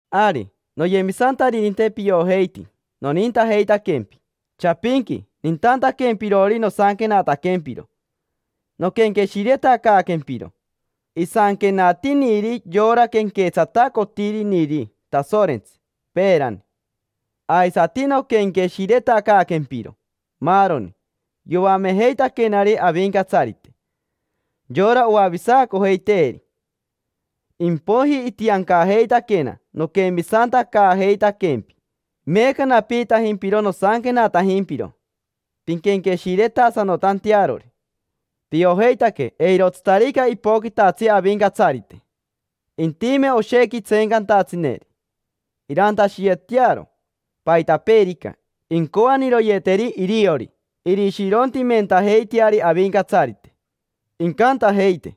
Ari, noyemisantaririnte, piojeiti nonintajeitaquempi. Chapinqui nintantaquempirori nosanquenataquempiro, noquenqueshiretacaaquempiro isanquenatiniri yora quenquetsatacotiriniri Tasorentsi peerani. Aisati noquenqueshiretacaaquempiro maaroni yoamejeitaquenari Avincatsarite, yora oavisacojeiteeri. Impoiji itiancajeitaquena noquemisantacaajeitaquempi. Meeca napiitajimpiro nosanquenatajimpiro pinquenqueshiretasanotantearori. Piojeitaque eirotsitarica ipoquitatsi Avincatsarite, intime oshequi tseencantatsineri, irantashiyetearo paitapeerica incoaniroyeteri iriori. Irishirontimentajeiteari Avincatsarite, incantajeite: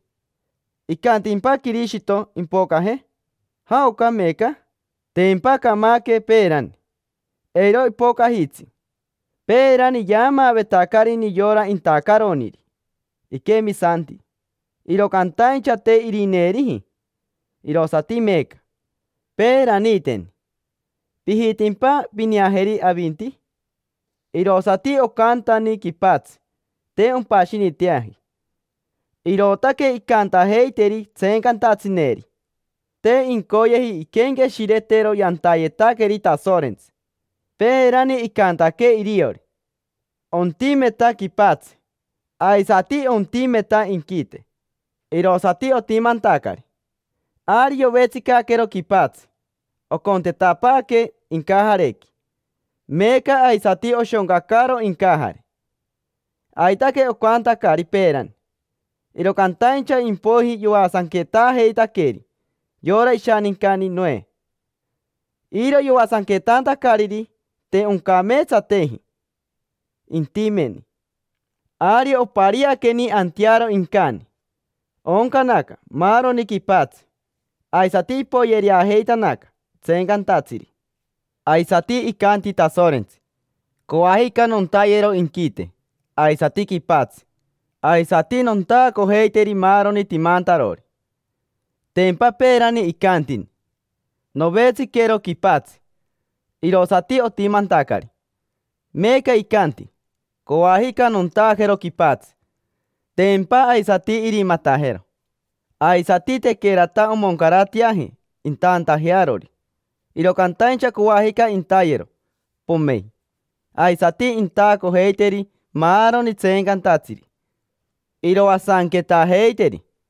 “¿Icantimpa Quirishito impocaje? Iji, iji, iji. ¿Jaocari meeca? Tempa camaque peerani. Eiro ipocajitsi. Peerani yaamaavetacarini yora intacaroniri iquemisanti, iro cantaincha te irineeriji, irosati meeca. Peeraniiteni. ¿Pijitimpa pineajeri avinti? Iji, iji. Irosati ocantani quipatsi, te ompashiniteaji”. Irootaque incantajeiteri tseencantatsineri. Te incoyeji inquenqueshiretero yantayetaqueri Tasorentsi. Peerani icantaque iriori: “Ontimeta quipatsi, aisati ontimeta inquite”, irosati otimantacari. Ari yovetsicaquero quipatsi, ocontetapaaque incajarequi, meeca aisati oshoncacaro incajare. Aitaque ocantacari peerani, iro cantaincha impoiji yoasanquetaajeitaqueri yora ishanincani Noe. Iro yoasanquetantacariri, te oncameetsateji intimeni. Ari opariaqueni antearo incani, ooncanaca maaroni quipatsi, aisati ipoyereajeitanaca tseencantatsiri. Aisati icanti Tasorentsi: “Coajica nontayero inquite aisati quipatsi, aisati nontaacojeiteri maaroni timantarori”. Tempa peerani icantini “Novetsiquero quipatsi”, irosati otimantacari. Meeca icanti: “Coajica nontaajero quipatsi”, tempa aisati irimatajero. Aisati tequerata omoncarateaji intaantajearori, iro cantaincha coajica intayero, pomein, aisati intaacojeiteri maaroni tseencantatsiri, iroasanquetaajeiteri.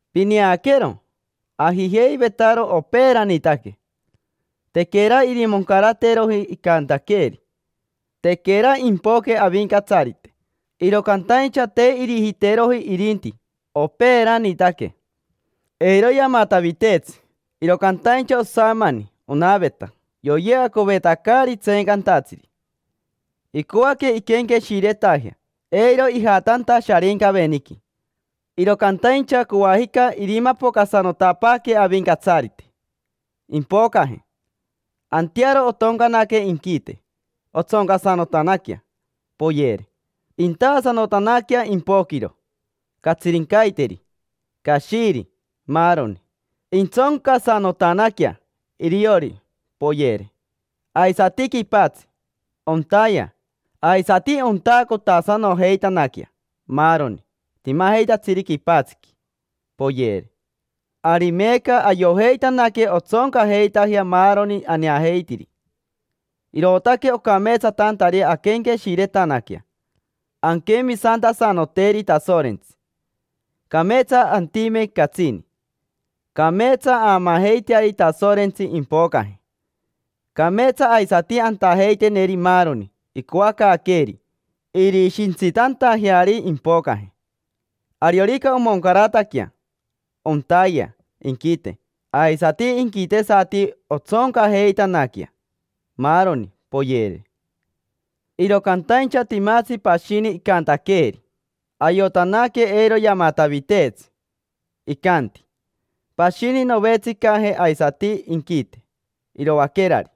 Pineaquero, ajijeivetaro opeeranitaque, tequera irimoncarateroji icantaqueeri: tequera impoque Avincatsarite. Iro cantaincha te irijiteroji irinti opeeranitaque. Eiro yamataviteetsi, iro cantaincha osamani onaveta yoyeacovetacari tseencantatsiri, icoaque inquenqueshiretajea eiro ijatanta Sharincaveniqui. Iro cantaincha coajica irimapocasanotapaaquee Avincatsarite, impocaje. Antearo ontoncanaque inquite, ton; ontsoncasanotanaquea, poyere. Intaasanotanaquea impoquiro, catsirincaiteri, cashiri, maaroni: pomein, intsoncasanotanaquea iriori, poyere. Aisati quipatsi, ontayea; aisati ontaacotasanojeitanaquea maaroni timajeitatsiri quipatsiqui, pomein, poyere. Ari meeca ayojeitanaque ontsoncajeitajea maaroni aneajeitiri, irootaque ocameetsatantari anquenqueshiretanaquea, anquemisantasanoteri Tasorentsi, cameetsa antime catsini. Cameetsa aamaajeiteari Tasorentsi impocaje, cameetsa aisati antajeiteneri maaroni icoacaaqueeri irishintsitantajeari impocaje. Ariorica omoncarataquea, ontayea inquite aisati inquitesati ontsoncajeitanaquea, maaroni, poyere. Iro cantaincha timatsi pashini icantaqueeri, ayotanaque eiro yamataviteetsi. Icanti: “Pashini novetsicaje aisati inquite iroaquerari,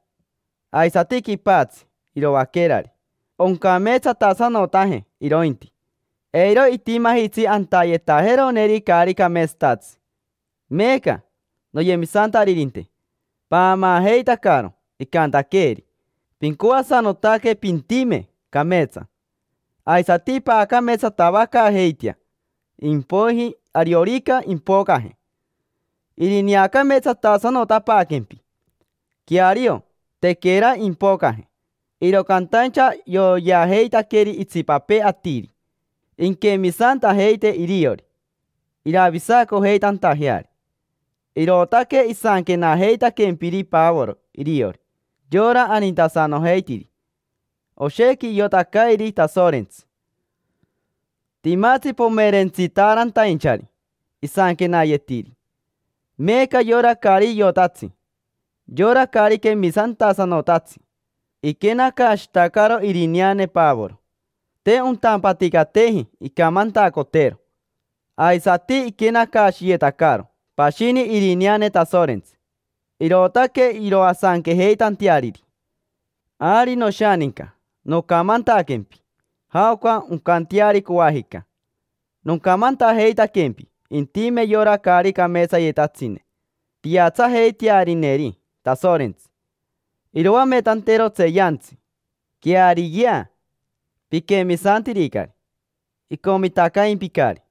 aisati quipatsi iroaquerari. Oncameetsatasanotaje irointi, eiro itimajitsi antayetajeroneri caari cameetsatatsi”. Meeca, noyemisantaririnte, paamaajeitacaro icantaqueeri. Pincoasanotaque pintime cameetsa, aisati paacameetsatavacaajeitea; impoiji ariorica impocaje, irineacameetsatasanotapaaquempi. Queario, tequera impocaje, iro cantaincha yoyeajeitaqueri itsipapee atiri inquemisantajeite iriori iravisacojeitantajeari. Irootaque isanquenajeitaquempiri Pavoro iriori, yora anintasanojeitiri. Oshequi iotacairi Tasorentsi. Timatsi pomerentsitaarantainchari isanquenayetiri. Meeca yora caari iotatsi, yora caari quemisantasanotatsi, iquenacaashitacaro irineane Pavoro, te ontampaticateji incamantacotero. Aisati iquenacaashiyetacaro pashini irineane Tasorentsi, irootaque iroasanquejeitanteariri. Ari, noshaninca, nocamantaquempi jaoca oncanteari coajica. Nocamantajeitaquempi intime yora caari cameetsayetatsine, piatsajeitearineri Tasorentsi, iroametantero tseeyantsi. Queariyea, piquemisantiricari, icomitacaimpicari.